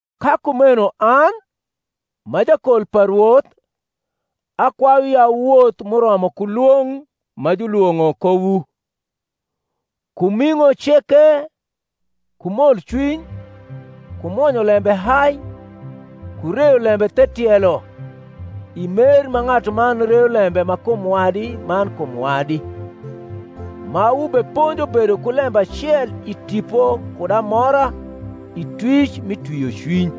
Ka kumeno an, m’a jakol pa Rwoth, akwayuwu ya wuwoth m’uromo ku lwong’ ma julwong’o kowu, ku ming’o ceke ku molcwiny, ku mwonyo lembe hai, ku reyo lembe the tielo i mer ma ng’atuman reyo lembe ma kum wadi man kum wadi; ma wubeponjo bedo ku lembe acel i Tipo kud amora i twic mi twiocwiny.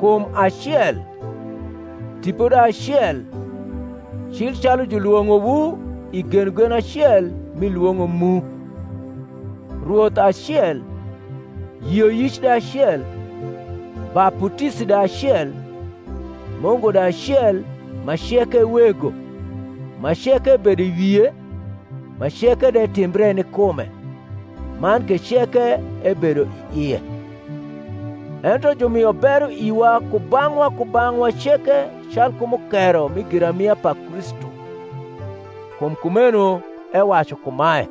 Kum acel, Tipo de acel, cil calu julwong’owu i genogen acel mi lwong’o mu; Rwoth acel, yioyic de acel, baputisi de acel, Mungu de acel ma ceke e Wego, ma ceke ebedo i wie, ma ceke de timbre ni kume, man ke ceke ebedo i ie. Ento jumio bero iwa kubang’wa kubang’wa ceke calku mukero mi giramia pa Kristu. Kum kumeno ewacu kumae,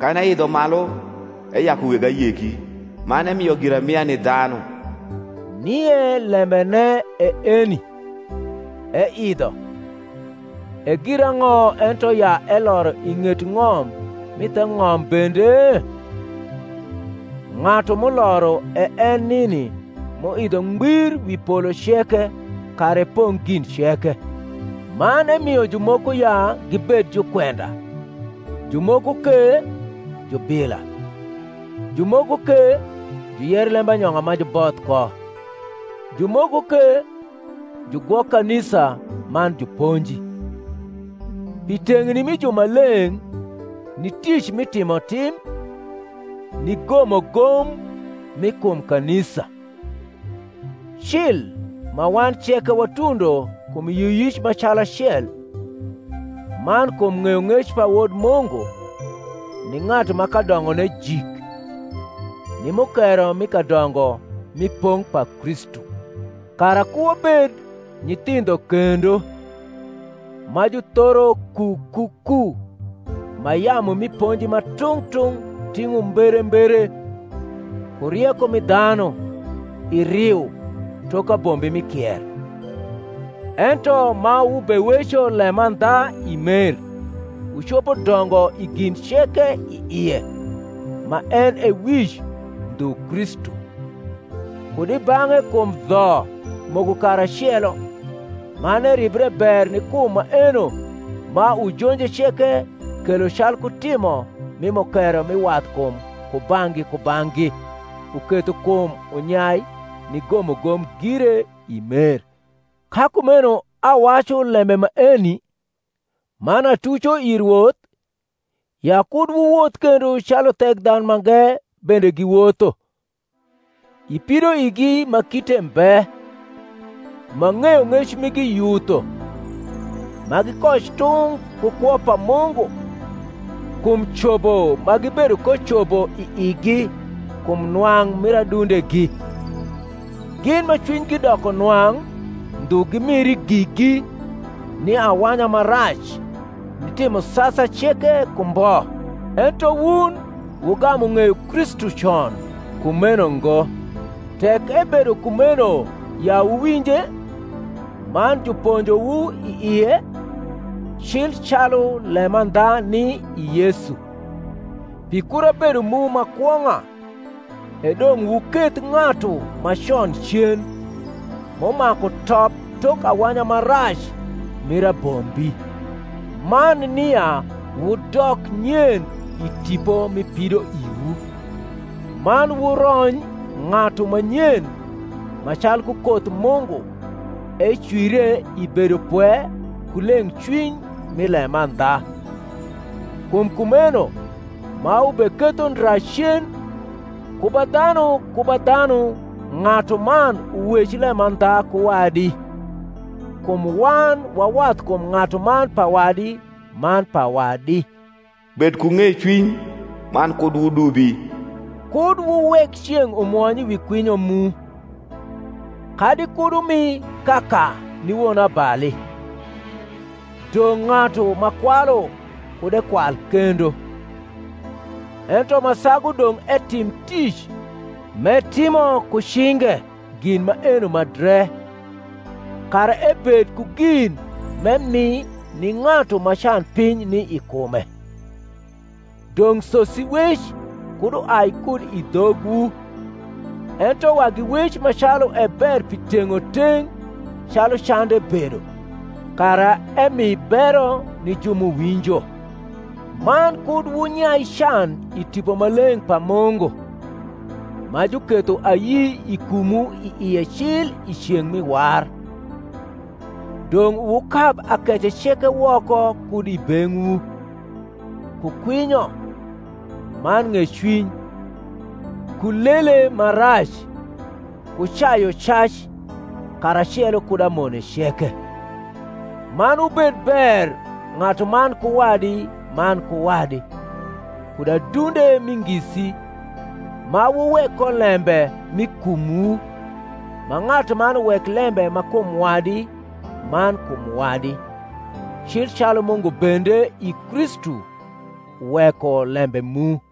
Kan eidho malu, eyaku weg ayeki, Man emio giramia ni dhanu. (Nie lembene e eni, Eidho, e girang’o ento ya eloro i ng’et ng’om m’i the ng’om bende? Ng’atu m’uloro e en nini m’uidho ngbir wi polo ceke, kara epong’ gin ceke.) Man emio jumoko ya gibed jukwenda; jumoko ke, jubila; jumoko ke, juyer lembanyong’a ma juboth ko; jumoko ke, jugwok kanisa man juponji; pi teng’ni mi jumaleng’ ni ric mi timotim, ni gomogom mi kum kanisa: cil, ma wan ceke watundo kum yioyic ma calacel, man kum ng’eyong’ec pa Wod Mungu, ni ng’atu ma kadongone jik, ni mukero mi kadongo mi pong’ pa Kristu: kara ku wabed nyithindho kendo, ma juthoro ku ku ku ma yamu mi ponji ma tung’ tung’ ting’o mberembere, ku rieko mi dhanu, i riu, tok abombi mi kier; ento ma wubeweco lemandha i mer, wucopo dongo i gin ceke i ie, ma en e wic, ndhu Kristu; kud i bang’e kum dho moko karacelo man eribre ber ni kum maeno ma ujonje ceke kelo calku timo mi mukero mi wathkum kubang’gi kubang’gi, uketho kum unyai ni gomogom gire i mer. Ka kumeno awacu lembe maeni, man atuco i Rwoth, ya kud wuwoth kendo calu Thekdhanumange bende giwotho, i pidoigi ma kite mbe, ma ng’eyong’ec migi yutho, ma gikoc tung’ ku kwo pa Mungu, kum cobo ma gibedo ko cobo i igi, kum nwang’ mir adundegi; gin ma cwinygi doko nwang’ ndhu gi, miri gigi ni awanya ma rac, ni timo sasa ceke ku mbo. Ento wun wugamu ng’eyo Kristu con kumeno ngo; tek ebedo kumeno ya wuwinje, man juponjowu i ie, cil calu lemandha ni i Yesu: pi kura bedo mu ma kwong’a, e dong’ wuketh ng’atu ma con cen, m’umaku top tok awanya ma rac mir abombi; man nia wudok nyen i tipo mi pidoiwu, man wurony ng’atu ma nyen ma calku koth Mungu ecwire i bedopwe ku leng’cwiny mi lemandha. Kum kumeno, ma wubeketho ndra cen, ku ba dhanu ku ba dhanu ng’atuman uwec lemandha ku wadi: kum wan wa wathkum ng’atuman pa wadi man pa wad. Bed ku ng’ecwiny, man kud wudubi: kud wuwek ceng’ umwony wi kwinyo mu: kadi kud wumi kaka ni wonabali. Dong’ ng’atu ma kwalu kud ekwal kendo: ento ma sagu dong’ etim tic, m’etimo ku cinge gin maeno ma dre, kara ebed ku gin m’emi ni ng’atu ma canpiny ni i kume. Dong’ sosiwec kud uai kud i dhogwu, ento wagi wec ma calu e ber pi teng’oteng’ calu cande bedo, kara emi bero ni ju m’uwinjo. Man kud wunyai can i Tipo Maleng’ pa Mungu, ma juketho ayi i kumwu i ie cil i ceng’ mi war. Dong’ wukab akece ceke woko kud i beng’wu, ku kwinyo, man ng’ecwiny, ku lele ma rac, ku cayucac, karacelo kud amone ceke: man wubed ber ng’atuman ku wadi man ku wadi, kud adunde mi ngisi, ma wuwek ko lembe m’i kumwu, ma ng’atuman uwek lembe ma kum wadi man kum wadi, cil calu Mungu bende i Kristu uweko lembe mu.